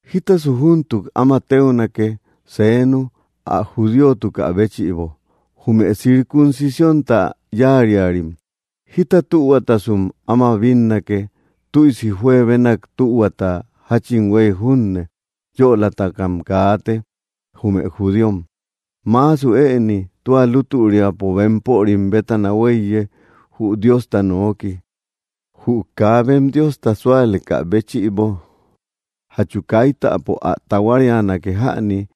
¿Jítasu júntuk áma téunake, seenu, ä judíotukä béchïbo? Jume circuncisiónta yáariarim, ¿jita tühuatasum áma bínnake? Tüisi juebenak tühuata; jáchin huéy junne yölatakam kaate, jume judíom. Maasu ëni tua lútüriapo, bempörim bétana huéiye, jü Diosta nooki. Jü kaa bem Diosta súalekä béchïbo, ¿jachu kaitapo ä tahuarianake jäni,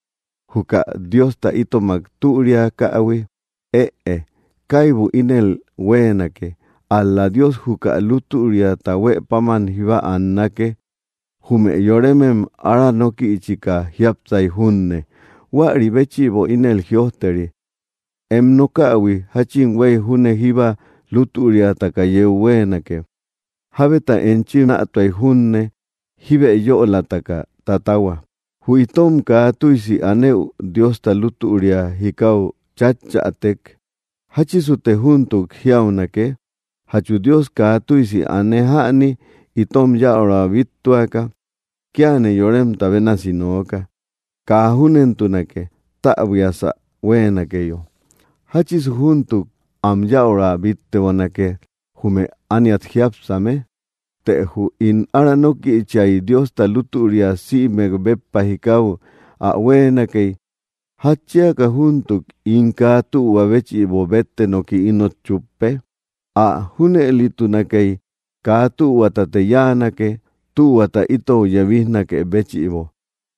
juka Diosta itomak türiakähui? ¡Ëe! ¡Kaibu ínel huéenake! Ál‑la Dios juka lútüriata huë páman jíba annake, jume yoremem ára nókïchika jiápsay junne. Huäri béchïbo ínel jïojteri: Em nokähui jáchin huéy júne jíba lutüriataka yeu huéenake; jábeta enchi nätuay junne, jíbe yölataka tatahua. Jü itom kaa tüisi anëu Diosta lútüria jikau chatchätek, ¿jáchisute júntuk jiaunake? ¿Jachu Dios kaa tüisi ane jäni, itom yäura bíttuaka? (Kíane yoremta bénasi nooka.) ¡Kaa júnentunake! Täbuiasä huéenakeyo, ¿jáchisu júntuk am yäura bíttebonake, jume ániat jiápsame? Të jü ín ára nókïchiay Diosta lútüria sïmek béppa jikau ä huéenakey, ¿jatchiaka júntuk ín kaa tühua béchïbo bétte noki ínot chúppe? Ä junëlitunakey, kaa tühuatate yáanake, tühuata itou yebijnakë béchïbo.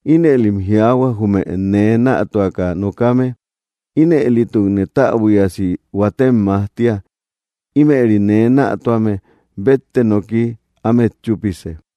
Inëlim jiaahua, jume nee nätuaka nokame, ínëlitukne täbuiasi huatem majtia. Ímëri nee nätuame bétte noki ámet chúpise.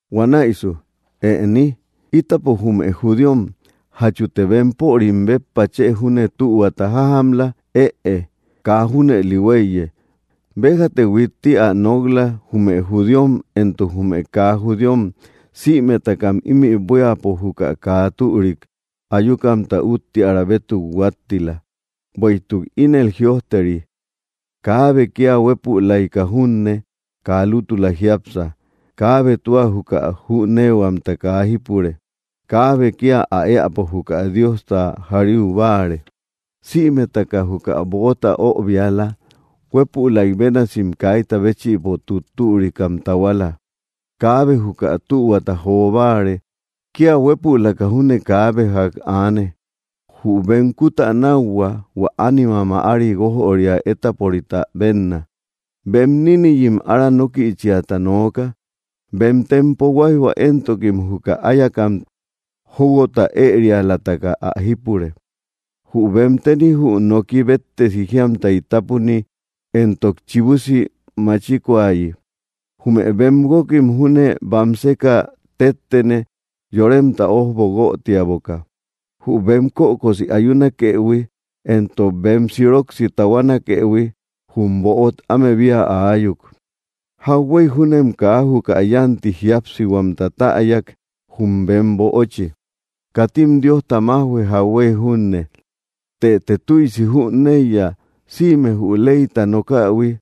Huanäisu, ¿ëni? Ítapo jume judíom, ¿jachute bempörim béppa chë júne tühuata jajamla? Ëe; kaa junëli huéiye. Béjate huitti ä nok‑la, jume judíom entok jume kaa judíom sïmetakam ímï buíapo juka kaa türik ayukamta úttiära bétuk huáttila. Bueïtuk ínel jïojteri: Kaabe, kía huépülaika junne, kaa lútula jiápsa; kaabe tua juka jüneehuamta kaa jípure. Kaabe kía ä éäpo juka Diosta jariu báare. Sïmetaka juka böota öbiala; huépülaik bénasim kaita béchïbo tuttürikam tahuala; kaabe juka tühuata jo báare; kía huépülaka júne kaabe ják aane. Jü bem kutänauhua hua ánima mäari guójoria étaporita benna; bem níniyim ára nókïchiata nooka. Bem tempo huáijhua éntokim juka áyakam jóuhuota ërialataka ä jípure; jü bem teni jü noki béttesi jiamtay tápuni entok chibusi machikoayi. Jume bem guókim júne bamseka téttene, yoremta ójbo guötiaboka; jü bem kökosi ayunakëhui entok bem siroksi tahuanakëhui, jum böot ámebia aayuk. Jauhuey júnem kaa juka yánti jiápsihuamta täyak, jum bem böochi. Katim Diosta májhue, jauhuey junne. Tëte tüisi jüneiya, sïme jü leyta nokähui,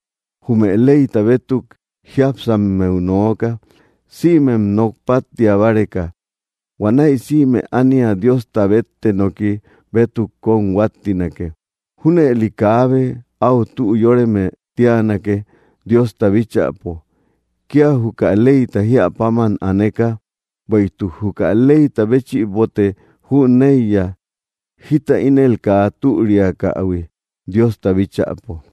jume leyta bétuk jiápsammeu nooka, sïmem nok páttia báreka. Huanäi sïme ánia Diosta bétte noki bétuk kóm huáttinake. Júnëli kaabe áu tü yóreme tíanake, Diosta bíchäpo, kía juka leyta jíä páman aneka. Bueïtuk juka leyta béchïbote jüneiya, jita ínel kaa türiakähui, Diosta bíchäpo.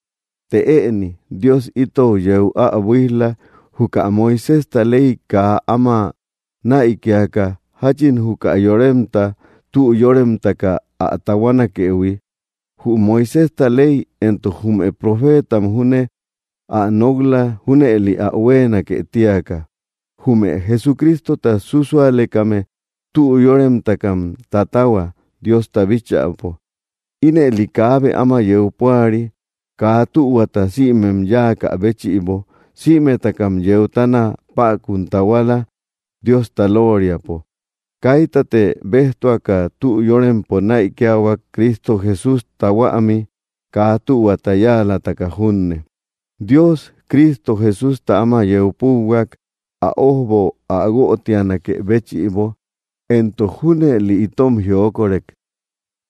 Të ëni, Dios itou yeu ä buíj‑la, juka Moiséjta ley kaa áma näikiaka, jáchin juka yoremta tü yóremtaka ä tahuanakëhui. Jü Moiséjta ley entok jume profeetam júne ä nok‑la, junëli ä huéenake tíaka: jume Jesucristota súsualekame tü yóremtakam tatahua, Diosta bíchäpo. Ínëli kaabe áma yeu púari. Kaa tühuata sïmem yáakä béchïbo, sïmetakam yeutana päkun tahuala, Diosta lóoriapo. Kaitate béjtuaka tü yórempo näikiahuak, Cristo Jesústa huämi, kaa tühuata yáalataka junne. Dios, Cristo Jesústa áma yeu púuhuak, ä ójbo ä guötianakë béchïbo entok junëli itom jiokorek.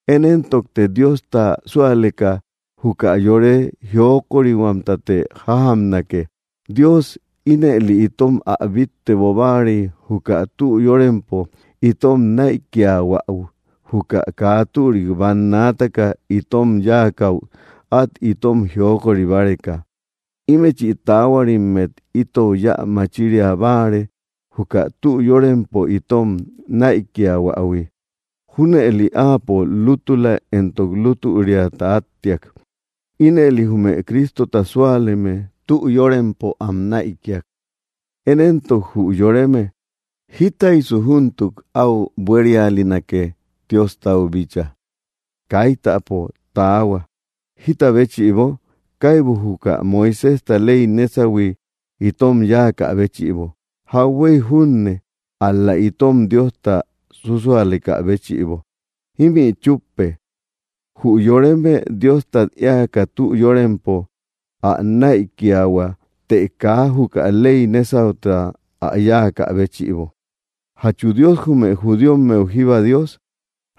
Én éntokte Diosta súaleka juka yore jiokorihuamtate jajamnake. Dios ínëli itom ä bittebo báarey juka tü yórempo itom näikiahuäu juka kaa türik bannaataka itom yáakäu át itom jiokori báreka. Ímëchi taahuarimmet itou yä machiria báare, juka tü yórempo itom näikiähuähui. Júnëli Áapo lútula entok lútüriata áttiak; ínëli jume Cristota súaleme tü yórempo am näikia. Én éntok jü yoreme, ¿jitaysu júntuk áu buérialinake, Diostau bíchaa? ¡Kaitapo taahua! ¿Jíta béchïbo? Kaibu juka Moiséjta ley nesahui itom yáakä béchïbo, jauhuey junne, ál‑la itom Diosta súsualekä béchïbo. Ímï chúppe: Jü yoreme Diostat éaka tü yórempo ä näikiahua, të kaa juka ley nésauta ä yáakä béchïbo. ¿Jachu Dios jume judíommeu jíba Dios?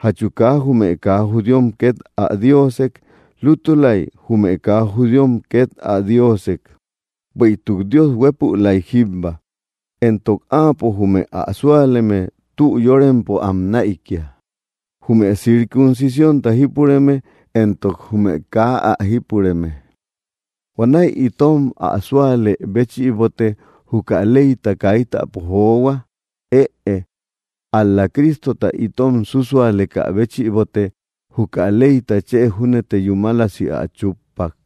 ¿Jachu kaa jume kaa judíom két ä Diosek? Lútulay, jume kaa judíom két ä Diosek. Bueïtuk Dios huépülay jíbba. Entok Áapo jume ä súaleme tü yórempo am näikia, jume circuncisiónta jípureme entok jume kaa ä jípureme. ¿Huanäi itom ä súalë béchïbote juka leyta kaitapo johua? ¡Ëe! Al‑la Cristota itom súsualekä béchïbote juka leyta chë júnete yúmalisi ä chuppa.